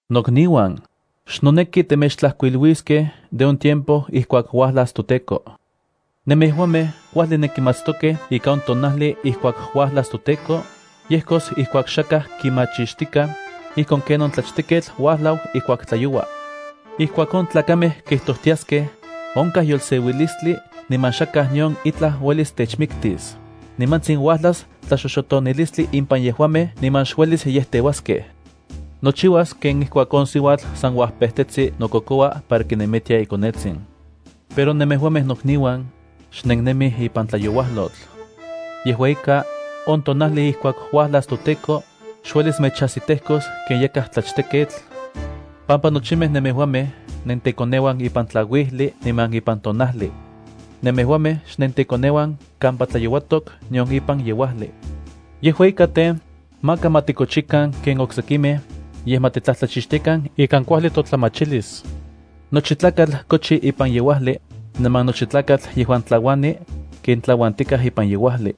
Nokniuan, xnoneki temechtlajkuiliskej de on tiempo ijkuak uajlas toTEKO. Nemejuamej kuajli nenkimatstokej ika on tonajli ijkuak uajlas toTEKO, yejkos ijkuak xakaj kimachixtikaj, ijkon ken on tlachteketl uajlau ijkuak tlayoua. Ijkuak on tlakamej kijtojtiaskej: “Onkaj yolseuilistli niman xakaj nion itlaj uelis techmiktis”, nimantsin uajlas tlaxoxotonilistli impan yejuamej niman xuelis yejteuaskej. Nochiuas ken ijkuak on siuatl san uajpejtetsi nokokoua para kinemitia ikonetsin. Pero nemejuamej nokniuan, xnennemij ipan tlayouajlotl. Yejua ika, on tonajli ijkuak uajlas toTEKO, xuelis mechajsitejkos ken yakaj tlachteketl, pampa nochimej nemejuamej nentekoneuan ipan tlauijli niman ipan tonajli. Nemejuamej xnentekoneuan kampa tlayouatok nion ipan yeuajli. Yejua ika tej, maka ma tikochikan ken oksekimej, yej ma titlajtlachixtiakan ikan kuajli totlamachilis. Nochi tlakatl kochi ipan yeuajli, niman nochi tlakatl yejuan tlauani, ken tlauantikaj ipan yeuajli.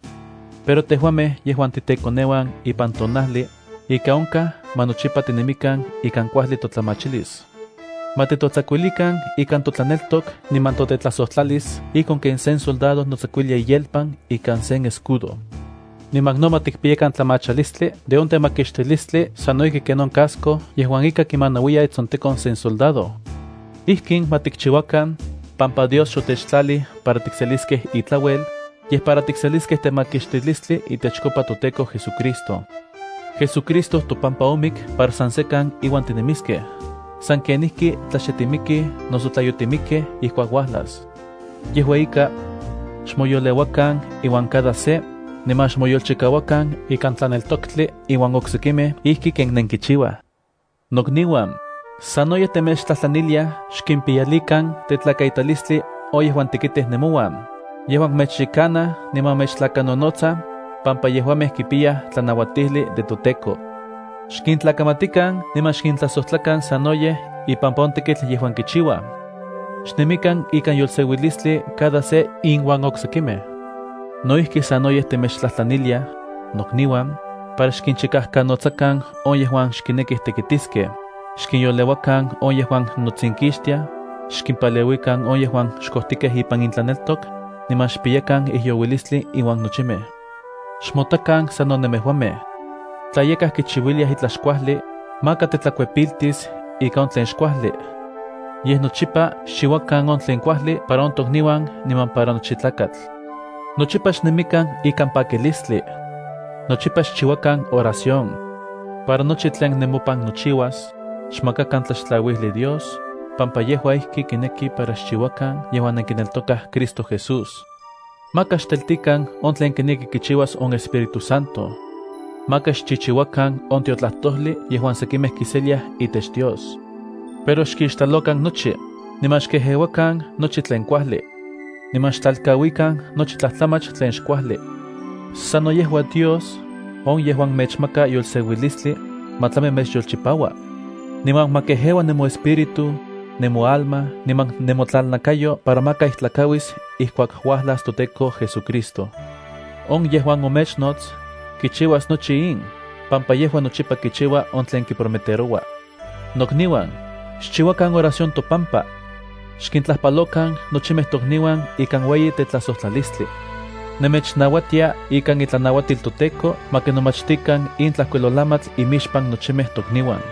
Pero tejuamej yejuan titekoneuan ipan tonajli, ika onkaj ma nochipa tinemikan ikan kuajli totlamachilis. Ma titotsakuilikan ikan totlaneltok niman totetlajsojtlalis ijkon ken sen soldado notsakuilia iyelpan ikan sen escudo. Niman no ma tikpiyakan tlamachalistli de on temakixtilistli sano ijki ken on casco yejuan ika kimanauiya itsontekon sen soldado. Ijkin ma tikchiuakan, pampa Dios xotechtlalij para tikseliskej itlauel, yej para tikseliskej temakixtilistli itechkopa toTEKO JesuCristo. JesuCristo topampa omik para san sekan iuan tinemiskej, san kenijki tla xe timikij noso tla yotimikkej ijkuak uajlas. Yejua ika, xmoyoleuakan iuan cada se, niman xmoyolchikauakan ikan tlaneltoktli iuan oksekimej ijki ken nenkichiuaj. Nokniuan, sanoyej temechtlajtlaniliaj xkimpiyalikan tetlakaitalistli on yejuan tekitij nemouan, yejuan mechyekanaj niman mechtlakanonotsaj, pampa yejuamej kipiyaj tlanauatijli de toTEKO. Xkintlakamatikan niman xkintlajsojtlakan sanoyej ipampa on tekitl yejuan kichiuaj. Xnemikan ikan yolseuilistli cada se inuan oksekimej. No ijki sanoyej temechtlajtlaniliaj, nokniuan, para xkinchikajkanotsakan on yejuan xkinekij tekitiskej, xkinyoleuakan on yejuan notsinkixtiaj, xkimpaleuikan on yejuan xkojtikej ipan intlaneltok, niman xpiyakan ijyouilistli inuan nochimej. Xmotakan sano nemejuamej. Tla yakaj kichiuiliaj itlaj xkuajli, maka tetlakuepiltis ika on tlen xkuajli. Yej nochipa xchiuakan on tlen kuajli para on tokniuan niman para nochi tlakatl. Nochipa xnemikan ikan pakilistli. Nochipa xchiuakan oración. Para nochi tlen nemopan nochiuas, xmakakan tlaxtlauijli Dios, pampa yejua ijki kineki para xchiuakan yejuan nenkineltokaj Cristo Jesús. Maka xteltikan on tlen kineki kichiuas on Espíritu Santo. Maka xchichiuakan on tiotlajtojli yejuan sekimej kiseliaj itech Dios. Pero xkixtlalokan nochi, niman xkejeuakan nochi tlen kuajli. Niman xtlalkauikan nochi tlajtlamach tlen xkuajli. Sano yejua Dios, on yejuan mechmaka yolseuilistli, ma tlami mechyolchipaua. Niman ma kejeua nemoespíritu, nemoalma niman nemotlalnakayo para maka ijtlakauis ijkuak uajlas toTEKO JesuCristo. On yejuan omechnots kichiuas nochi in, pampa yejua nochipa kichiua on tlen kiprometeroua. Nokniuan, xchiuakan oración topampa. Xkintlajpalokan nochimej tokniuan ikan ueyi tetlajsojtlalistlia. Nemechnauatia ikan itlanauatil toTEKO ma kinomachtikan in tlajkuilolamatl imixpan nochimej tokniuan.